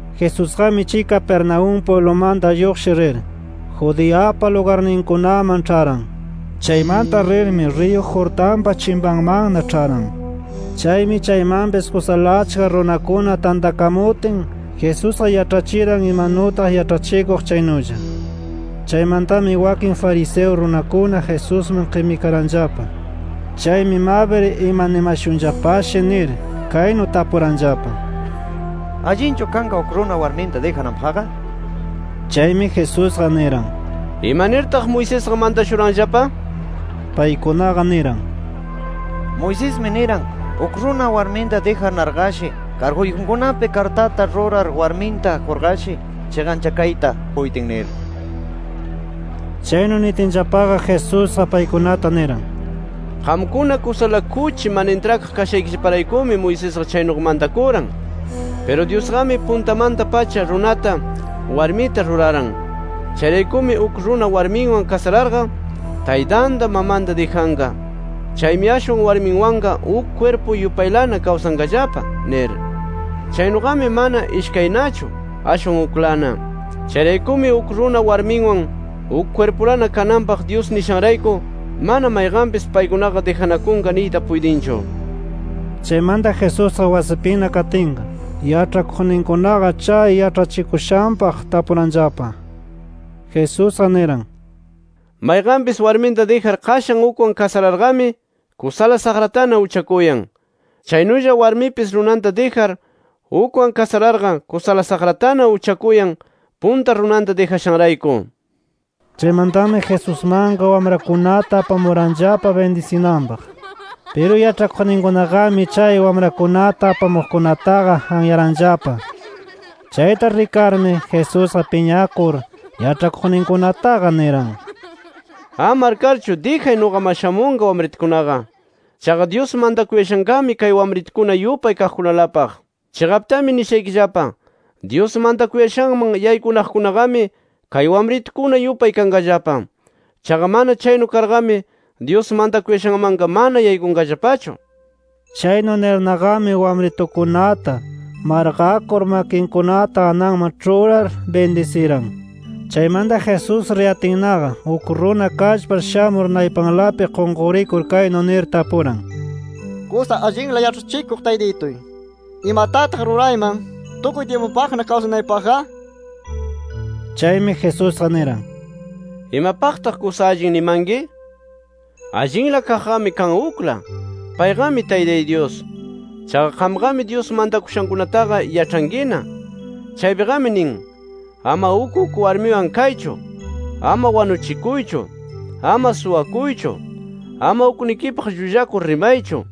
Jesusqami chay Capernaúm pwiblumanta lluqshir rir, Judeapa lugarninkunaman ĉharan. Chaymanta rirmi, riyu Jordanpa chimpanmanna ĉharan. Chaymi chaymanpis kusala achka runakuna tantakamutin Jesusqa yaĉhachiran imanutaq yaĉhachikuq chaynulla. Chaymantami wakin fariseo runakuna Jesusman qimikaranllapa. Chaymi mabir imanimashunllapashi nir, kaynu tapuranllapa: —¿Allinchu kanqa uk runa warminta dijananpaqqa? nir. Chaymi Jesusqa niran: —¿Ima nirtaq Moisesqa mantashuranllapa? Paykunaqa niran: —Moisesmi niran, uk runa warminta dijanarqashi karguyjunkunapi kartata rurar warminta qurqashi chiqanchakayta puytin nir. Chaynu nitinllapaqa Jesusqa paykunata niran: —Qamkuna kusala kuchi mana intrakaq kashaykillaparaykumi Moisesqa chaynuqa mantakuran. Piru Dyusqami puntamanta-pacha runata, warmita ruraran. Chayraykumi, ‘Uk runa warminwan kasararqa, taytanta mamanta dijanqa. Chaymi ashwan warminwanqa uk kwirpu yupaylana kawsanqallapa’ nir. Chaynuqami mana ishkaynachu, ashwan uklana. Chayraykumi uk runa warminwan uk kwirpulana kananpaq Dyus nishanrayku, mana mayqanpis, paykunaqa dijanakunqa niyta puytinchu. Chaymanta Jesusqa wasipina katinqa, yaĉhakuqninkunaqa chay yaĉhachikushanpaq tapuranllapa. Jesusqa niran: “Mayqanpis warminta dijar qashan ukwan kasararqami kusala saqratana uchakuyan. Chaynulla warmipis runanta dijar, ukwan kasararqa kusala saqratana uchakuyan, punta runanta dijashanrayku” nir. Chaymantami Jesusmanqa wamrakunata apamuranllapa, bindisinanpaq. Piru yaĉhakuqninkunaqami chay wamrakunata apamuqkunataqa anyaranllapa. Chayta rikarmi, Jesusqa piñakur yaĉhakuqninkunataqa niran: “¡Ama arkarchu, dijay nuqaman shamunqa wamritukunaqa! Chaqa Dyus mantakuyashanqami kay wamritukuna yupay kaqkunalapaq. Chiqaptami nishaykillapa: Dyus mantakuyashanman yaykunaqkunaqami kay wamritukuna yupay kanqallapa. Chaqa mana chaynu karqami Dyus mantakuyashanmanqa mana yaykunqallapachu”. Chaynu nirnaqami wamritukunata, marqakur makinkunata ananman ĉhurar bindisiran. Chaymanta Jesús riyatinnaqa uk runa kallpar shamur naypalanpi qunqurikur kaynu nir tapuran: —Kusa allinla yaĉhachikuq taytituy, ¿imatataq rurayman, tukuy tyimpupaqna kawsanaypaqqa? nir. Chaymi Jesusqa niran: —¿Imapaqtaq kusa allin nimanki? Allinla kaqqami kan ukla. Payqami Taytay Dyus. Chaqa qamqami Dyus mantakushankunataqa yaĉhankina. Chaypiqami nin: ‘Ama uk uk warmiwan kaychu; ama wanuchikuychu; ama suwakuychu; ama uknikipaq llullakur rimaychu;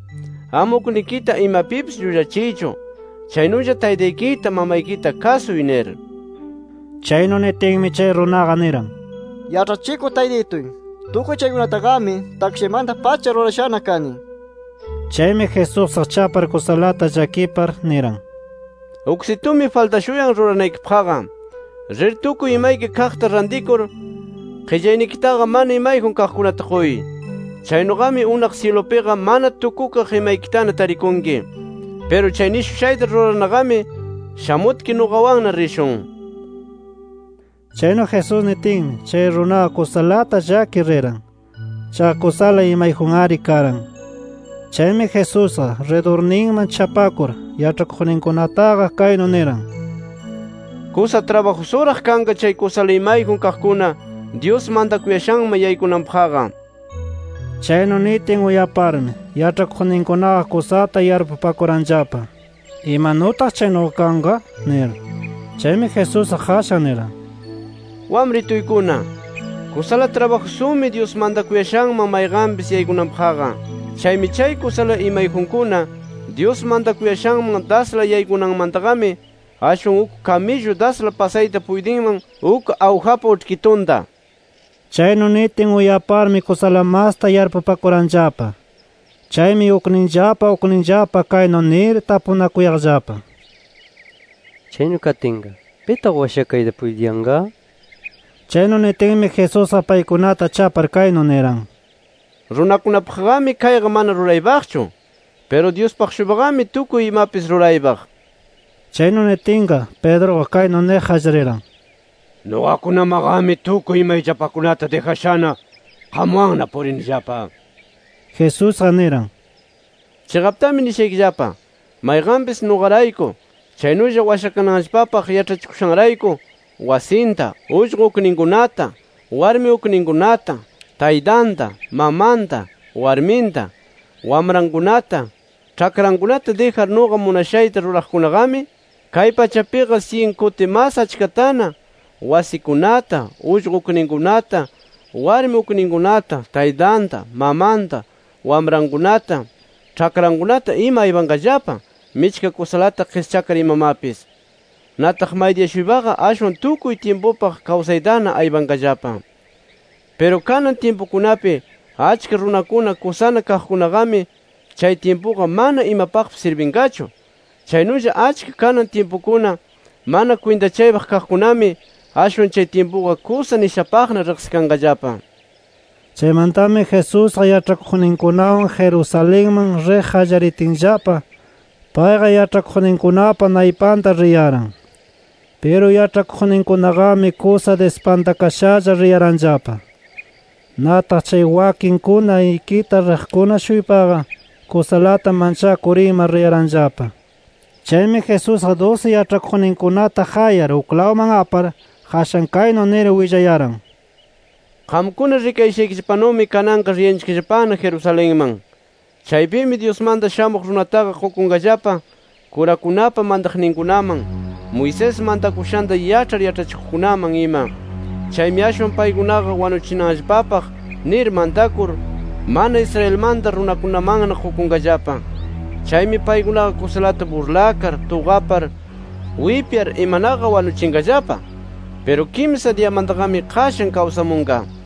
ama uknikita imapipis llullachiychu chaynulla taytaykita, mamaykita kasuy’ nir. Chaynu nitinmi, chay runaqa niran: —Yaĉhachikuq Taytituy, tukuy chaykunataqami takshaymanta-pacha rurashana kani nir. Chaymi Jesusqa chapar kusalata llakipar, niran: —Uksitumi faltashuyan ruranaykipaqqa: Rir, tukuy imayki kaqta rantikur qillaynikitaqa mana imayjun kaqkunata quy. Chaynuqami unaq syilupiqa mana tukukaq imaykitana tarikunki. Piru chay nishushayta rurarnaqami, shamutki nuqawanna rishun nir. Chaynu Jesús nitinmi, chay runaqa kusalata llakir riran. Chaqa kusala imayjun-ari karan. Chaymi Jesusqa, ridurninman chapakur yaĉhakuqninkunataqa kaynu niran: —Kusa trabajusuraq kanqa chay kusala imayjun kaqkuna, Dyus mantakuyashanman yaykunanpaqqa. Chaynu nitin uyaparmi, yaĉhakuqninkunaqa kusata yarpupakuranllapa: “¿Imanutaq chaynuqa kanqa?” nir. Chaymi Jesusqa qashan niran: —Wamrituykuna ¡kusala trabajusumi Dyus mantakuyashanman mayqanpis yaykunanpaqqa! Chaymi chay kusala imayjunkuna, Dyus mantakuyashanman dasla yaykunanmantaqami, ashwan uk kamillu dasla pasayta puytinman uk awjapa uĉhkitunta nir. Chaynu nitin uyaparmi kusala masta yarpupakuranllapa. Chaymi ukninllapa ukninllapa kaynu nir tapunakuyaqllapa: —Chaynu katinqa ¿pitaq washakayta puytiyanqa? nir. Chaynu nitinmi Jesusqa paykunata chapar kaynu niran: —Runakunapaqqami kayqa mana ruraypaqchu. Piru Dyuspaq-shuypaqami tukuy imapis ruraypaq nir. Chaynu nitinqa, Pedruqa kaynu niq qallariran: —Nuqakunamaqami tukuy imayllapakunata dijashana, qamwanna purinillapa. Jesusqa niran: —Chiqaptami nishaykillapa: Mayqanpis nuqarayku, chaynulla washakananllapapaq yaĉhachikushanrayku wasinta, ullqu ukninkunata, warmi ukninkunata, taytanta, mamanta, [warminta,] wamrankunata, ĉhakrankunata dijar nuqa munashayta ruraqkunaqami, kay pachapiqa syin kuti mas achkatana, wasikunata, ullqu ukninkunata, warmi ukninkunata, taytanta, mamanta, wamrankunata, ĉhakrankunata ima aypanqallapa michka kusalata qischakar imamapis. Nataq maydiya-shuypaqa ashwan tukuy tyimpupaq kawsaytana aypanqallapa. Piru kanan tyimpukunapi achka runakuna kusana kaqkunaqami, chay tyimpuqa mana imapaqpis sirbinqachu. Chaynulla achka kanan tyimpukuna mana kwintachaypaq kaqkunami, ashwan chay tyimpuqa kusa nishapaqna riqsikanqallapa. Chaymantami Jesusqa yaĉhakuqninkunawan Jerusalenman riq qallaritinllapa, payqa yaĉhakuqninkunapa naypanta riyaran. Piru yaĉhakuqninkunaqami kusa dispantakashalla riyaranllapa. Nataq chay wakinkuna ikita riqkuna-shuypaqa kusalata manchakur ima riyaranllapa. Chaymi Jesusqa dusi yaĉhakuqninkunata qayar uklawman apar, qashan kaynu nir willayaran: “Qamkuna rikayashaykillapanumi kananqa riyanchikllapana Jerusalenman. Chaypimi Dyusmanta Shamuq Runataqa qukunqallapa, kurakunapa mantakuqninkunaman, Moisés mantakushanta yaĉhar yaĉhachikuqkunaman ima. Chaymi ashwan paykunaqa wanuchinanllapapaq nir mantakur, mana Israelmanta runakunamanna qukunqallapa. Chaymi paykunaqa kusalata burlakar, tuqapar, wipyar imanaqa wanuchinqallapa. Piru kimsa diyamantaqami qashan kawsamunqa” nir.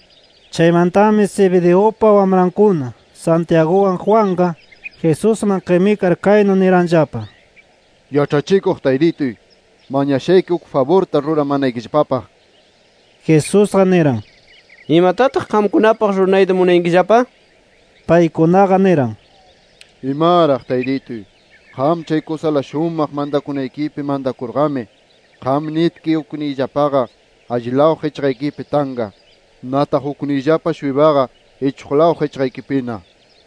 Chaymantami Zebedeupa wamrankuna Santiaguwan Juanqa, Jesusman qimikar kaynu niranllapa: —Yaĉhachikuq Taytituy, mañashayki uk faburta ruramanaykillapapaq. Jesusqa niran: —¿Imatataq qamkunapaq ruranayta munayankillapa? nir. Paykunaqa niran: —Imaraq taytituy, qam chay kusala shumaq mantakuynikipi mantakurqami, qam nitki ukniyllapaqa allilaw qichqaykipi tanqa; nataq ukniyllapa-shuypaqa ichuqlaw qichqaykipina nir.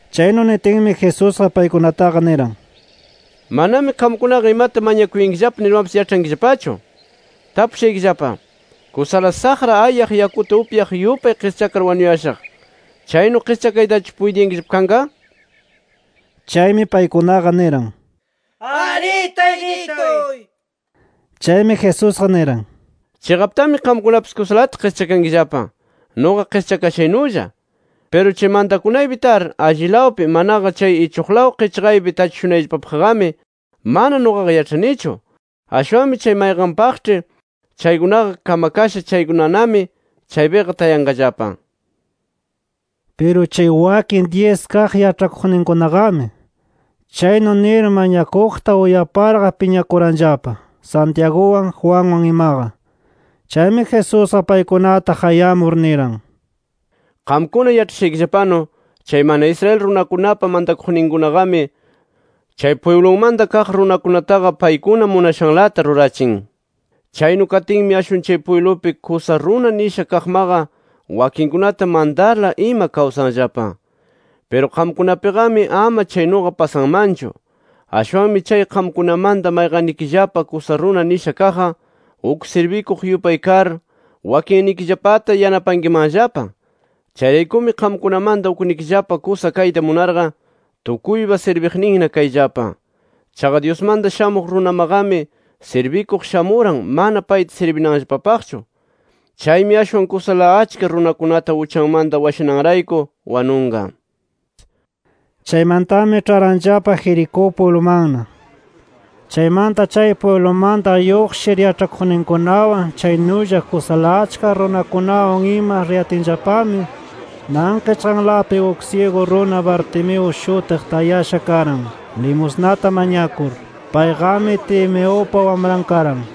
Chaynu nitinmi Jesusqa paykunataqa niran: —Manami qamkunaqa imata mañakuyankillapa nirmapis yaĉhankillapachu. Tapushaykillapa: ¿Kusala saqra ayaq yakuta upyaq yupay qischakar wanuyashaq, chaynu qischakaytachu puytiyankillapa kanqa? nir. Chaymi paykunaqa niran: —Arí Taytituy nir. Chaymi Jesusqa niran: —Chiqaptami qamkunapis kusalata qischakankillapa, nuqa qischakashaynulla. Piru chay mantakunaypi tar allilawpi manaqa chay ichuqlaw qichqaypi tachishunayllapapaqqami mana nuqaqa yaĉhanichu. Ashwanmi chay mayqanpaqĉhi chaykunaqa kamakasha chaykunanami chaypiqa tayanqallapa nir. Piru chay wakin dyis kaq yaĉhakuqninkunaqami, chaynu nir mañakuqta uyaparqa piñakuranllapa Santiaguwan Juanwan imaqa. Chaymi Jesusqa paykunata qayamur niran: —Qamkuna yaĉhashaykillapanu, chay mana Israel runakunapa mantakuqninkunaqami, chay pwiblunmanta kaq runakunataqa paykuna munashanlata rurachin. Chaynu katinmi ashwan chay pwiblupi kusa runa nisha kaqmaqa, wakinkunata mantarla ima kawsanllapa. Piru qamkunapiqami ama chaynuqa pasanmanchu. Ashwanmi chay qamkunamanta mayqannikillapa kusa runa nisha kaqqa, uk sirbikuq yupay kar wakinnikillapata yanapankimanllapa. Chayraykumi qamkunamanta uknikillapa kusa kayta munarqa, tukuypa sirbiqninna kayllapa. Chaqa Dyusmanta Shamuq Runamaqami sirbikuq shamuran mana payta sirbinanllapapaqchu. Chaymi ashwan kusala achka runakunata uchanmanta washananrayku, wanunqa. Chaymantami ĉharanllapa Jericó pwiblumanna. Chaymanta chay pwiblumanta lluqshir yaĉhakuqninkunawan chaynulla kusala achka runakunawan ima riyatinllapami nan qichqalanpi uk syigu runa Bartimeo shutiq tayasha karan, limusnata mañakur. Payqami Timeupa wamran karan.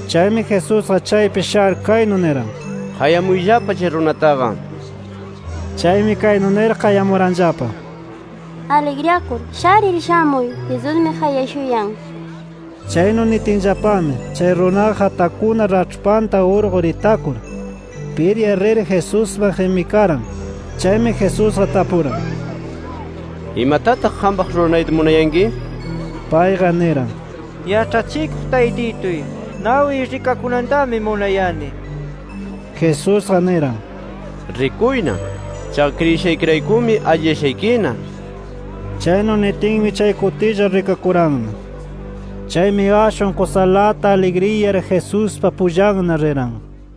Chaymi Jesusqa chaypi shar, kaynu niran: —Qayamuyllapa chay runataqa nir. Chaymi kaynu nir qayamuranllapa: —Aligriyakur, sharir shamuy. Jesusmi qayashuyan nir. Chaynu nitinllapami, chay runaqa qatakuna raĉhpanta urqur itakur, piryar rir Jesusman qimikaran. Chaymi Jesusqa tapuran: —¿Imatataq qampaq ruranayta munayanki? nir. Payqa niran: —Yaĉhachikuq Taytituy, nawiy rikakunantami munayani nir. Jesusqa niran: —Rikuyna. Chaqa kriyishaykiraykumi alliyashaykina. Chaynu nitinmi chay kutilla rikakuranna. Chaymi ashwan kusalata aligriyar Jesuspa pullanna riran.